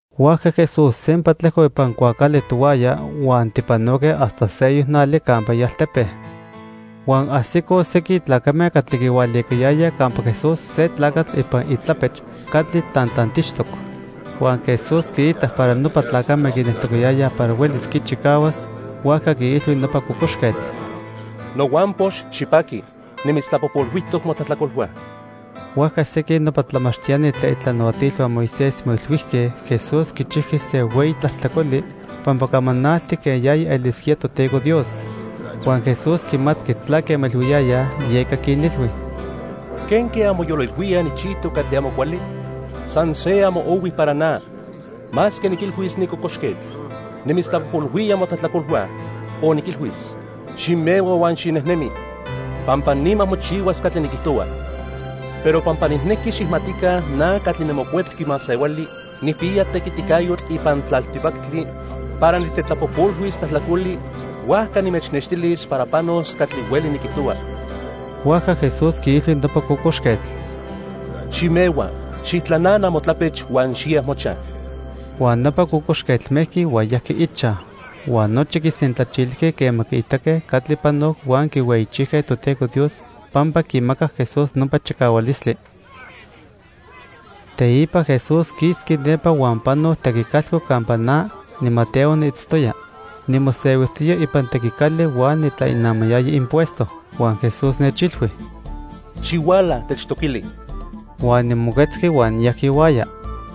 Huajca Jesús sempa tlejcoc ipan cuaacali tohuaya huan tipanoque hasta seyoc nali campa ialtepe. Huan ajsicoj sequin tlacame catli quihualicayayaj campa Jesús se tlacatl ipan itlapech catli tantantixtoc. Huan Jesús quiitac para nopa tlacame quineltocayayaj para huelis quichicahuas, huajca quiilhui nopa cocoxquetl: —Nohuampox, xipaqui. Nimitztlapojpolhuijtoc motlajtlacolhua. Huajca sequin nopa tlamachtiani tlen itlanahuatilhua Moisés moilhuijque Jesús quichijqui se hueyi tlajtlacoli pampa camanalti quen yaya elisquía Toteco Dios. Huan Jesús quimatqui tlaque moilhuiyayaj, yeca quinilhui: —¿Quenque anmoyolilhuíaj nijchijtoc catli amo cuali? San se amo ohui para na, masque niquilhuis ni cocoxquetl: 'Nimitztlapojpolhuía motlajtlacolhua', o niquilhuis: 'Ximehua huan xinejnemi', pampa nima mochihuas catli niquijtohua. Pero pampa nijnequi xijmatica na catli niMocuepqui Masehuali nijpiya tequiticayotl ipan tlaltipactli para nitetlapojpolhuis tlajtlacoli, huajca nimechnextilis para panos catli hueli niquijtohua. Huajca Jesús quiilhui nopa cocoxquetl: —Ximehua, xijtlanana motlapech huan xiya mochaj. Huan nopa cocoxquetl mejqui huan yajqui ichaj. Huan nochi quisentlachilijque quema quiitaque catli panoc huan quihueyichijque Toteco Dios pampa quimacac Jesús nopa chicahualistli. Teipa Jesús quisqui nepa huan panoc tequicalco campa na, niMateo, niitztoya. Nimosehuijtoya ipan tequicali huan nitlainamayaya impuesto. Huan Jesús nechilhui: —Xihuala, techtoquili. Huan nimoquetzqui huan niyajqui ihuaya.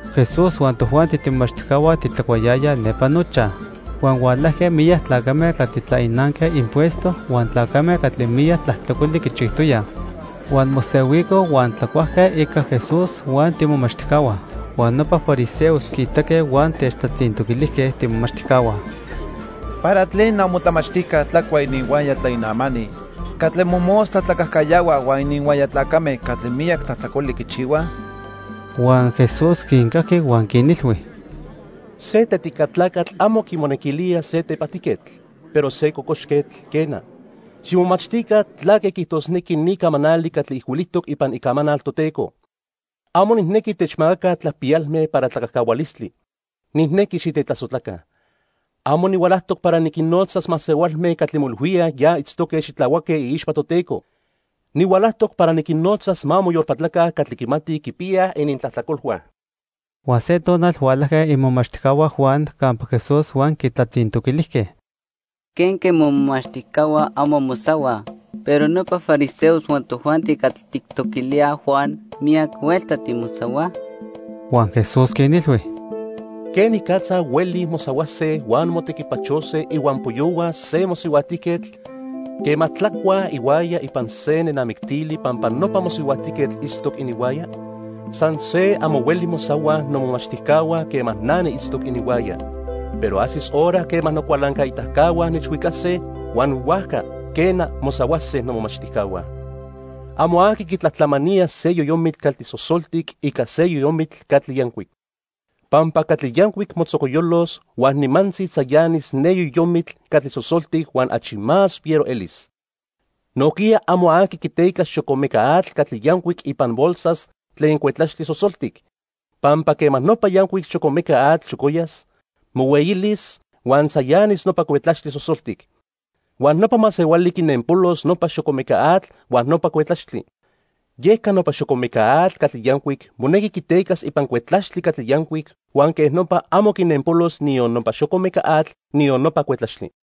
Jesús huan tojuanti tiimomachtijcahua titlacuayayaj nepa nochaj. Huan hualajque miyac tlacame catli tlainanque impuesto huan tlacame catli miyac tlajtlacoli quichijtoyaj. Huan mosehuicoj huan tlacuajque ica Jesús huan tiimomachtijcahua. Huan nopa fariseos quiitaque huan techtlatzintoquilijque tiimomachtijcahua: —¿Para tlen amotlamachtijca tlacua ininhuaya tlainamani catli mojmostla tlacajcayahuaj huan ininhuaya tlacame catli miyac tlajtlacoli quichihuaj? Huan Jesús quincajqui huan quinilhui: —Se tetica tlacatl amo quimonequilía se tepajtijquetl, pero se cocoxquetl, quena. Ximomachtica tlaque quiijtosnequi ni camanali catli ijcuilijtoc ipan Icamanal Toteco: 'Amo nijnequi techmacaca tlapiyalme para tlacajcahualistli. Nijnequi xitetlasojtlaca.' Amo nihualajtoc para niquinnotzas masehualme catli moilhuíaj ya itztoque xitlahuaque iixpa Toteco. Nihualajtoc para niquinnotzas ma moyolpatlaca catli quimatij quipiyaj inintlajtlacolhua. Huan se tonal hualajque imomachtijcahua Juan campa Jesús huan quitlatzintoquilijque: —¿Quenque momomachtijcahua amo mosahuaj, pero nopa fariseos huan tojuanti catli tijtoquilíaj Juan miyac huelta timosahuaj? Huan Jesús quinilhui: —¿Quenicatza huelij mosahuase huan motequipachose ihuampoyohua se mosihuajtijquetl quema tlacuaj ihuaya ipan se nenamictili pampa nopa mosihuajtijquetl itztoc ininhuaya? San se amo hueli mosahuaj nomomachtijcahua quema na niitztoc ininhuaya. Pero ajsis hora quema nocualancaitacahua nechhuicase, huan huajca, quena, mosahuase nomomachtijcahua. "Amo aqui quitlatlamanía se yoyomitl catli sosoltic ica se yoyomitl catli yancuic. Pampa catli yancuic motzocoyolos huan nimantzi tzayanis ne yoyomitl catli sosoltic huan achi más fiero elis. Nojquiya amo aqui quiteca xocomeca atl catli yancuic ipan bolsas tlen cuetlaxtli sosoltic, pampa quema nopa yancuic xocomeca atl xocoyas, mohueyilis, huan tzayanis nopa cuetlaxtli sosoltic. Huan nopa masehuali quinenpolos nopa xocomeca atl huan nopa cuetlaxtli. Yeca nopa xocomeca atl catli yancuic monequi quitecas ipan cuetlaxtli catli yancuic huan quej nopa amo quinenpolos niyon nopa xocomeca atl, niyon nopa cuetlaxtli."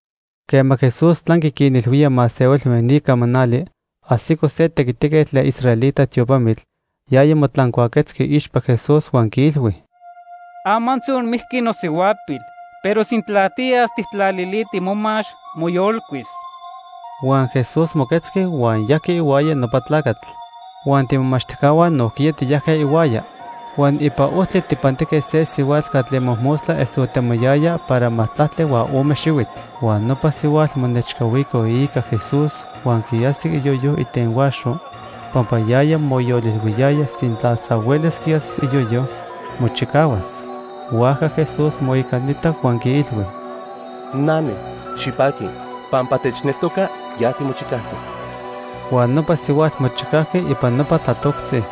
Quema Jesús tlanqui quinilhuía masehualme ni camanali, ajsico se tequitiquetl tlen israelita tiopamitl. Yaya motlancuaquetzqui iixpa Jesús huan quiilhui: —Amantzi onmijqui nosihuapil, pero sintla tiyas tijtlaliti momax, moyolcuis. Huan Jesús moquetzqui huan yajqui ihuaya nopa tlacatl. Huan tiimomachtijcahua nojquiya tiyajque ihuaya. Huan ipan ojtli tijpantijque se sihuatl catli mojmostla esotemoyaya para majtlactli huan ome xihuitl. Huan nopa sihuatl monechcahuico iica Jesús huan quiajsic iyoyo itenhuaxo. Pampa yaya moyolilhuiyaya sintla san huelis quiajsis iyoyo, mochicahuas. Huajca Jesús moicanitac huan quiilhui: —Nane, xipaqui. Pampa techneltoca, ya timochicajtoc. Huan nopa sihuatl mochicajqui ipan nopa tlatoctzi.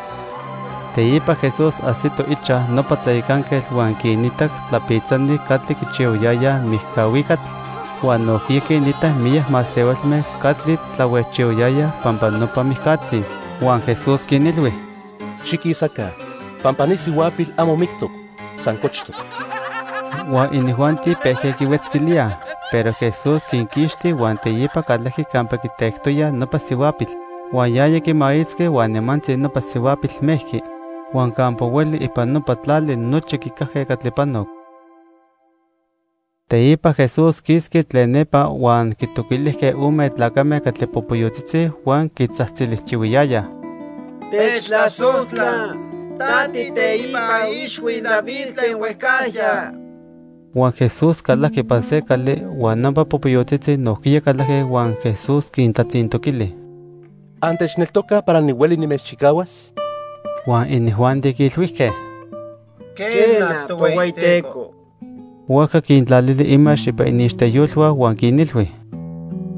Teipa Jesús ajsito ichaj nopa tlayacanquetl huan quinitac tlapitzani catli quichihuayayaj mijcahuicatl huan nojquiya quinitac miyac masehualme catli tlahuejchihuayayaj pampa nopa mijcatzi. Huan Jesús quinilhui: —Xiquisaca, pampa ni sihuapil amo mictoc, san cochtoc. Huan inijuanti pejque quihuetzquilíaj. Pero Jesús quinquixti huan teipa calajqui campa quitectoyaj nopa sihuapil. Huan yaya quimaitzqui huan nimantzi nopa sihuapil mejqui. Huan campa hueli ipan nopa tlali nochi quicajque catli panoc. Teipa Jesús quisqui tlen nepa huan quitoquilijque ome tlacame catli popoyotzitzi huan quitzajtzilijtiyohuiyayaj: —Techtlasojtla, ta tiiteipa ixhui David tlen huejcajya. Huan Jesús calajqui ipan se cali, huan nopa popoyotzitzi nojquiya calajque huan Jesús quintlatzintoquili: —¿Antechneltocaj para nihueli nimechchicahuas? Huan inijuanti quiilhuijque: —Quena, Tohueyiteco. Huajca quintlalili imax ipan iniixteyolhua huan quinilhui: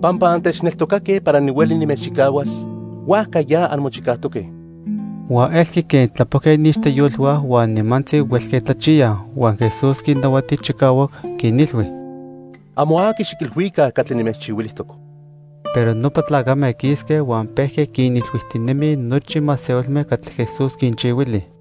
—Pampa antechneltocatoque para nihueli nimechchicahuas, huajca ya anmochicajtoque. Huan elqui quen tlapojque iniixteyolhua huan nimantzi huelque tlachiyaj. Huan Jesús quinnahuati chicahuac, quinilhui: —Amo aqui xiquilhuica catli nimechchihuilijtoc. Pero nopa tlacame quisque huan pejque quinilhuijtinemij nochi masehualme catli Jesús quinchihuili.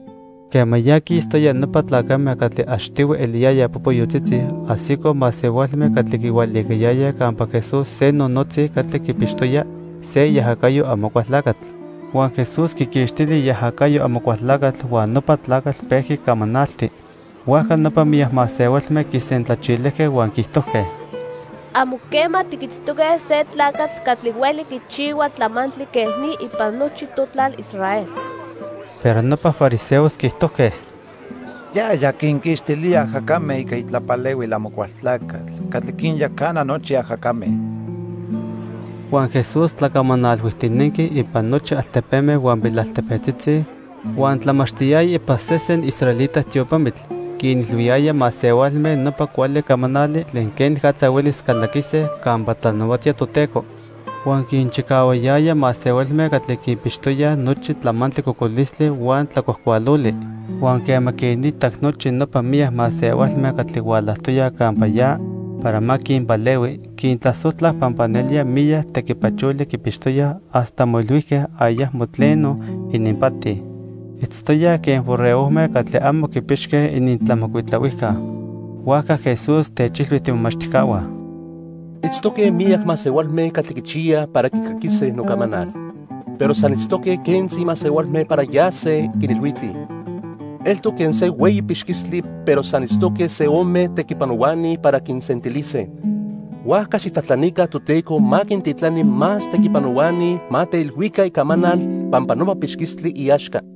Quema ya quistoyaj nopa tlacame catli achtihui eliyayaj popoyotzitzi, ajsicoj masehualme catli quihualicayayaj campa Jesús se nonotzi catli quipixtoya se iajacayo Amocualtlacatl. Huan Jesús quiquixtili iajacayo Amocualtlacatl, huan nopa tlacatl pejqui camanalti. Huajca nopa miyac masehualme quisentlachilijque huan quiijtojque: —Amo quema tiquitztoque se tlacatl catli hueli quichihua tlamantli quej ni ipan nochi totlal Israel. Pero nopa fariseos quiijtojque: —Yaya quinquixtilía ajacame ica itlapalehuil Amocualtlacatl catli quinyacana nochi ajacame. Huan Jesús tlacamanalhuijtinenqui ipan nochi altepeme huan pilaltepetzitzi, huan tlamachtiyaya ipan sesen israelita tiopamitl. Quinilhuiyaya masehualme nopa cuali camanali tlen quenicatza huelis calaquise campa tlanahuatía Toteco. Huan quinchicahuayaya masehualme catli quipixtoyaj nochi tlamantli cocolistli huan tlacuajcualoli. Huan quema quinitac nochi nopa miyac masehualme catli hualajtoyaj campa ya para ma quinpalehui, quintlasojtlac pampa nelía miyac tequipacholi quipixtoyaj hasta moilhuijque ayacmo tleno ininpati. Itztoyaj quen borregojme catli amo quipixque inintlamocuitlahuijca. Huajca Jesús techilhui tiimomachtijcahua: —Itztoque miyac masehualme catli quichiyaj para quicaquise nocamanal, pero san itztoque quentzi masehualme para yase quinilhuitij. Eltoc quen se hueyi pixquistli pero san itztoque se ome tequipanohuani para quisentilise. Huajca xijtlajtlanica Toteco ma quintitlani más tequipanohuani ma teilhuica icamanal pampa nopa pixquistli iaxca.